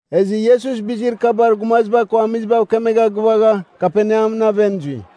Ezɨ Iesus bizir kabar gumaziba ko amizibav kemegha gɨvagha, Kaperneamɨn aven zui.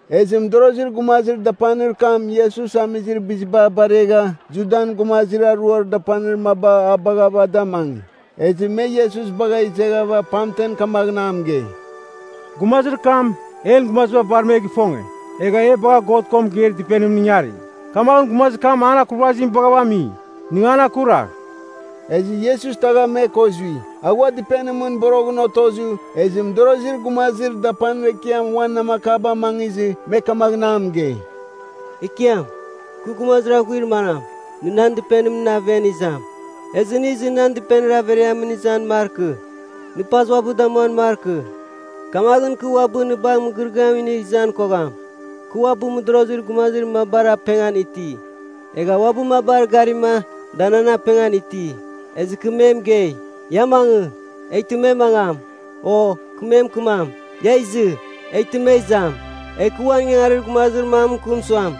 Ezɨ mɨdorozir gumazir dapanir kam Iesus amizir biziba baregha Judan gumazir aruar dapanir maba a baghava da amangi. Ezɨ me Iesus bagha izeghava pamtem kamaghɨn a mɨgei, “Gumazir kam en gumazamiziba bar me gifonge. Egha e bagha God ko mɨgeir dɨpenimɨn ingari. Kamaghɨn gumazir kam an akurvazim baghava ami, nɨ an akuragh.” Ezɨ Iesus tagha me ko zui. A ghua dɨpenimɨn boroghɨn otozɨ, ezɨ mɨdorozir gumazir dapanir ekiam uan namakaba amangizɨ me kamaghɨn a mɨgei, “Ekiam, kɨ gumazir aghuir manam, nɨ nan dɨpenimɨn aven izam? Ezɨ nɨ izɨ nan dɨpenimɨn averiamɨn izan markɨ. Nɨ paz uabɨ damuan markɨ. Kamaghɨn kɨ uabɨ nɨ bagh mɨgɨrɨgɨam inigh izan kogham. Kɨ uabɨ mɨdorozir gumazir mabar apengan iti, egha uabɨ mabar garima, da nan apengan iti. Ezɨ kɨ me mɨgei, ‘Ia mangɨ,’ eghtɨ me mangam. O, kɨ me mɨkɨmam, ‘Ia izɨ.’ Eghtɨ me izam. Egh kɨ uan ingangarir gumazir mam mɨkɨm suam,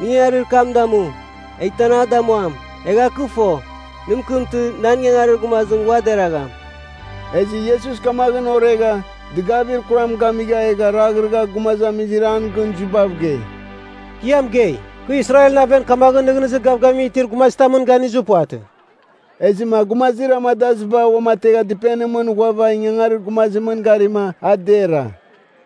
nɨ ingangarir kam damu, eghtɨ an a damuam. Egha kɨ fo, nɨ mɨkɨmtɨ, nan ingangarir gumazim ua deragham.” Ezɨ Iesus kamaghɨn oregha, dɨgavir kuram gamigha, egha raghrɨgha gumazamizir a gɨn zuibav gei, “Kɨ ia mɨgei, kɨ Israelɨn aven kamaghɨn nɨghnɨzir gavgavim itir gumazitamɨn ganizir puvatɨ.” Ezɨma gumazir amadaziba uamategha dɨpenimɨn ghuava ingangarir gumazimɨn garima a dera.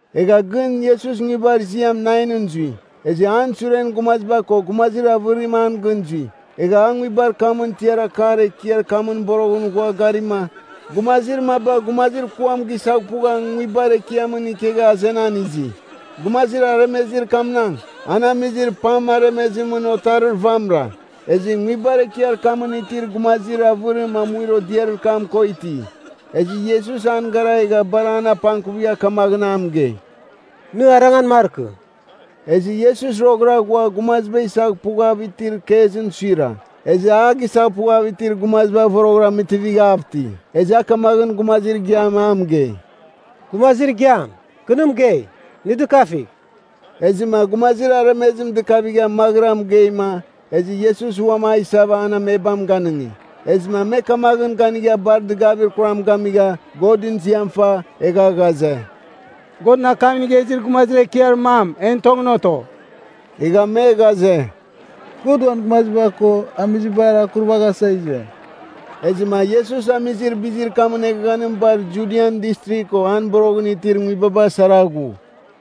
Egha gɨn Iesus nguibar ziam Nainɨn zui. Ezɨ an suren gumaziba ko gumazir avɨrim an gɨn zui. Egha a nguibar kamɨn tiar akar ekiar kamɨn boroghɨn ghua garima, gumazir maba gumazir kuam gisaghpugha nguibar ekiamɨn ikegha azenan izi. Gumazir aremezir kamnagh, an amizir pam aremezimɨn otarir vamɨra. Ezɨ nguibar ekiar kamɨn itir gumazir avɨrim amuir odiarir kam ko iti. Ezɨ Iesus an gara egha bar an apangkuvigha kamaghɨn a mɨgei, “Nɨ arangan markɨ.” Ezɨ Iesus roghɨra ghua gumaziba isaghpughav itir kezɨn suira. Ezɨ a gisaghpughav itir gumaziba voroghɨra mɨtivighav iti. Ezɨ a kamaghɨn gumazir igiam a mɨgei, “Gumazir igiam, kɨ nɨ mɨgei, nɨ dɨkafigh.” Ezɨma gumazir aremezim dɨkavigha maghɨra mɨgeima, ezɨ Iesus uam a isava an amebam ganɨngi. Ezɨma me kamaghɨn ganigha bar dɨgavir kuram gamigha, Godɨn ziam fa, egha ghaze, “Godɨn akam inigha izir gumazir ekiar mam en tongɨn oto.” Egha me ghaze, “God uan gumaziba ko amizibar akurvaghasa ize.” Ezɨma Iesus amizir bizir kamɨn eghaghanim bar Judian Distrigh ko an boroghɨn itir nguibaba sara ghu.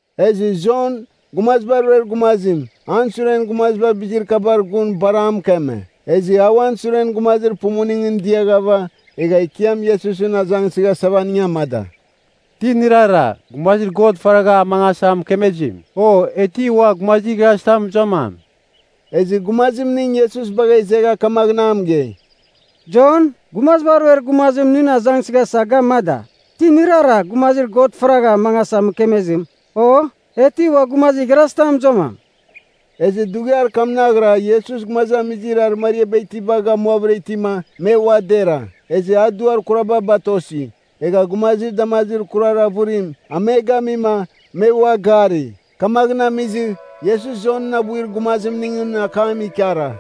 Ezɨ Jon, Gumaziba Ruer Gumazim, an suren gumaziba bizir kabar gun bar a mɨkeme. Ezɨ a uan suren gumazir pumuningɨn diaghava, egha Ekiam Iesusɨn azangsɨghasava aning amada, “Ti nɨrara, gumazir God faragha amangasa mɨkemezim? O, e ti ua gumazir igharazitam mɨzuamam?” Ezɨ gumazimning Iesus bagha izegha, kamaghɨn a mɨgei, “Jon, Gumaziba Ruer Gumazim nɨn azangsɨghasa ga amada, ‘Ti nɨrara, gumazir God faragha amangasa mɨkemezim? O, e ti ua gumazir igharazitam mɨzuamam?’” Ezɨ dughiar kamnaghra Iesus gumazamizir arɨmariaba itiba gamuavɨra itima, me ua dera. Ezɨ a duar kuraba batosi, egha gumazir damazir kurar avɨrim, a me gamima, me ua gari. Kamaghɨn amizɨ, Iesus Jonɨn abuir gumazimningɨn akam ikara,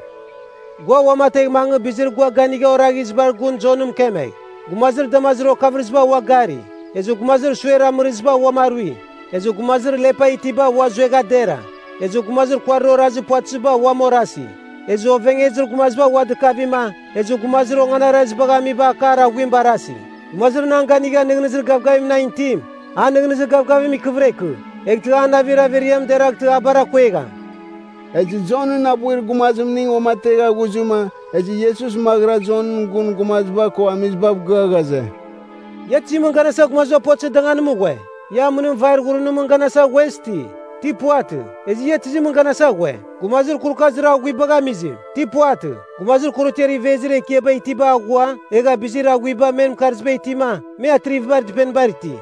“Gua uamategh mangɨ bizir gua ganigha oraghizibar gun Jonɨn mɨkemegh! ‘Gumazir damazir okavɨrɨziba ua gari, ezɨ gumazir suer amɨrɨziba uam arui. Ezɨ gumazir lepa itiba ua zuegha dera, ezɨ gumazir kuarir orazir puvatɨziba uam orasi. Ezɨ ovengezir gumaziba ua dɨkavima, ezɨ gumazir onganarazibagh amiba akar aghuim barasi.’ Gumazir nan ganigha nɨghnɨzir gavgavim nan itim, an nɨghnɨzir gavgavim ikɨvɨra ikɨ, eghtɨ an navir averiam deraghtɨ a bar akuegham!” Ezɨ Jonɨn abuir gumazimning uamategha ghuzɨma, ezɨ Iesus maghɨra Jonɨn gun gumaziba ko amizibav gɨa ghaze, “Ia tizimɨn ganasa gumaziba puvatɨzir danganimɨn ghue? Ia amɨnim vair ghurunimɨn ganasa ghuez ti? Ti puvatɨ, ezɨ ia tizimɨn ganasa ghue? Gumazir kurukazir aghuibagh amizim? Ti puvatɨ, gumazir korotiar ivezir ekiaba itiba aghua egha bizir aghuiba men mɨkarzibar itima, me atrivibar dɨpenibar iti.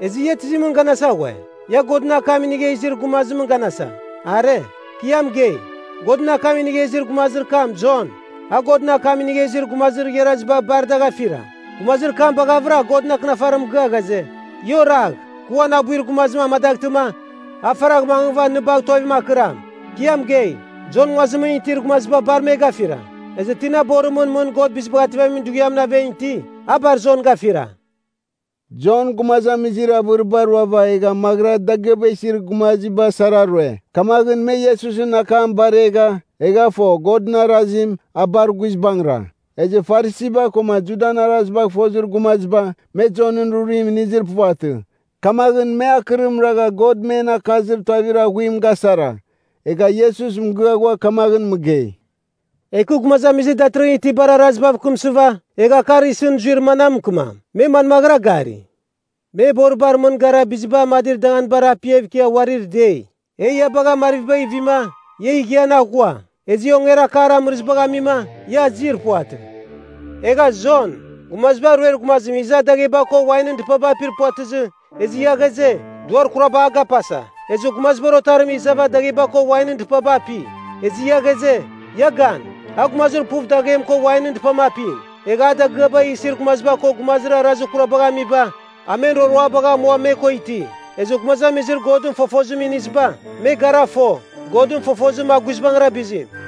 Ezɨ ia tizimɨn ganasa ghue? Ia Godɨn akam inigha izir gumazimɨn ganasa? Are. Kɨ ia mɨgei, Godɨn akam inigha izir gumazir kam Jon, a Godɨn akam inigha izir gumazir igharaziba bar dagh afira. Gumazir kam baghavɨra Godɨn Akɨnafarim mɨgɨa ghaze, ‘Ia oragh. Kɨ uan abuir gumazim amadaghtɨma, a faragh mangɨva nɨ bagh tuavim akɨram.’ Kɨ ia mɨgei, Jon nguazimɨn itir gumaziba bar me gafira, ezɨ tina borimɨn mɨn God Bizibagh Ativamin Dughiamɨn aven iti, a bar Jon gafira.” (Jon gumazamizir avɨriba ruava egha maghɨra dagɨaba isir gumaziba sara rue. Kamaghɨn me Iesusɨn akam baregha, egha fo Godɨn arazim, a bar guizbangɨra. Ezɨ Farisiba koma Judan arazibagh fozir gumaziba, me Jonɨn rurim inizir puvatɨ. Kamaghɨn me akɨrim ragha God men akazir tuavir aghuim gasara.) Egha Iesus mɨgɨa ghua kamaghɨn mɨgei, “Egh kɨ gumazamizir datɨrɨghɨn itibar arazibav kɨmsɨva, egha akar isɨn zuir manam mɨkɨmam? Me manmaghɨra gari? Me boribar mɨn gara biziba amadir danganibar apiav ikia uarir dei, ‘E ia bagha marvibagh ivima, ia ighian aghua. Ezɨ e ongerakar amɨrɨzibagh amima, ia azir puvatɨ.’ Egha Jon, Gumaziba Ruer Gumazim iza dagheba ko wainɨn dɨpaba apir puvatɨzɨ, ezɨ ia ghaze, ‘Duar kuraba a gapasa.’ Ezɨ Gumazibar Otarim izava dagheba ko wainɨn dɨpaba api. Ezɨ ia ghaze, ‘Ia gan, a gumazir puv daghem ko wainɨn dɨpam apim. Egha a dagɨaba isir gumaziba ko gumazir arazir kurabagh amiba, a men roroabagh amua me ko iti.’ Ezɨ gumazamizir Godɨn fofozim iniziba, me gara fo, Godɨn fofozim a guizbangɨra bizim.”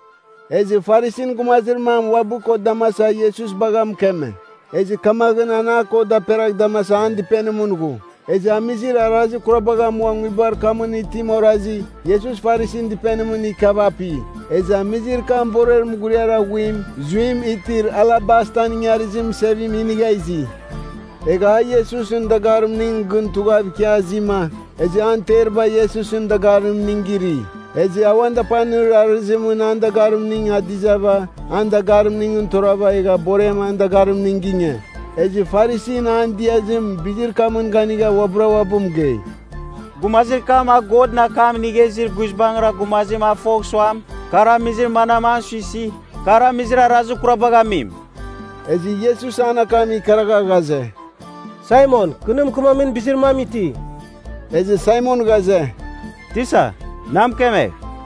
Ezɨ Farisin gumazir mam uabɨ ko damasava Iesus bagha mɨkeme. Ezɨ kamaghɨn an a ko daperagh damasa an dɨpenimɨn ghu. Ezɨ amizir arazir kurabagh amua nguibar kamɨn itim orazi, Iesus Farisin dɨpenimɨn ikiava api. Ezɨ amizir kam borer mughuriar aghuim zuim itir alabastan ingarizir mɨsevim inigha izi. Egha a Iesusɨn dagarimning gɨn tughav ikia azima, ezɨ an teriba Iesusɨn dagarimning giri. Ezɨ a uan dapanir arɨzimɨn an dagarimning adizava an dagarimningɨn torava egha borem an dagarimning ginge. Ezɨ Farisin an diazim bizir kamɨn ganigha uabɨra uabɨ mɨgei, “Gumazir kam a Godɨn akam inigha izir guizbangɨra gumazim a fogh suam, kar amizir manam an suisi, kar amizir arazir kurabagh amim.” Ezɨ Iesus an akam ikaragha ghaze, “Saimon kɨ nɨ mɨkɨmamin bizir mam iti.” Ezɨ Saimon ghaze, “Tisa, na mɨkemegh.”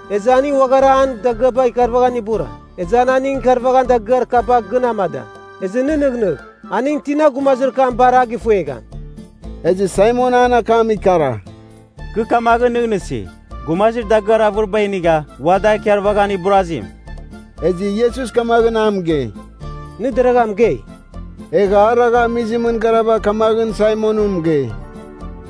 Ezɨ aning uaghara an dagɨaba ikarvaghan ibura. Ezɨ a aning ikarvaghamin dagɨar kaba gɨn amada. Ezɨ nɨ nɨghnɨgh, aningɨn tina gumazir kam bar a gifuegham?” Ezɨ Saimon an akam ikara, “Kɨ kamaghɨn nɨghnɨsi, gumazir dagɨar avɨriba inigha ua da ikarvaghan iburazim.” Ezɨ Iesus kamaghɨn a mɨgei, “Nɨ deragha mɨgei.” Egha a ragha amizimɨn garava kamaghɨn Saimonɨn mɨgei,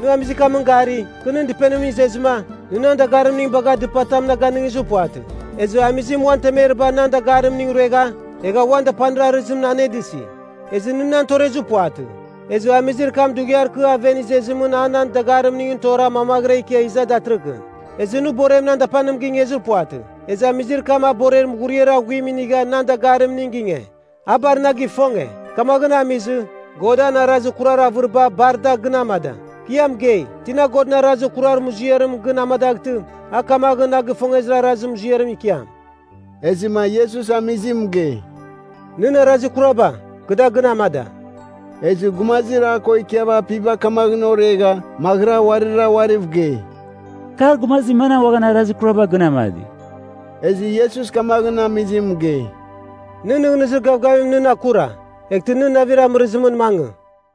“Nɨ amizir kamɨn gari? Kɨ nɨn dɨpenimɨn izezɨma, nɨ nan dagarimning bagha dɨpatam na ganɨngizir puvatɨ. Ezɨ amizim uan temeribar nan dagarimining ruegha, egha uan dapanir arɨzimɨn anedɨsi. Ezɨ nɨ nan torezir puvatɨ. Ezɨ amizir kam dughiar kɨ aven izezimɨn a nan dagarimningɨn tora mamaghɨra ikia iza datɨrɨkɨn. Ezɨ nɨ borem nan dapanim gingezir puvatɨ. Ezɨ amizir kam a borer mughuriar aghuim inigha nan dagarimning ginge. A bar na gifonge, kamaghɨn amizɨ, God an arazir kurar avɨriba bar da gɨn amada. Kɨ ia mɨgei, tina God an arazir kurar muziarim gɨn amadaghtɨ, a kamaghɨn na gifongezir arazir muziarim ikiam.” Ezɨma Iesus amizim mɨgei, “Nɨn arazir kuraba, kɨ da gɨn amada.” Ezɨ gumazir a ko ikiava apiba kamaghɨn oregha, maghɨra uarira uariv gei, “Kar gumazir manam uaghan arazir kuraba gɨn amadi?” Ezɨ Iesus kamaghɨn amizim mɨgei, “Nɨn nɨghnɨzir gavgavim nɨn akura. Eghtɨ nɨ navir amɨrɨzimɨn mangɨ.”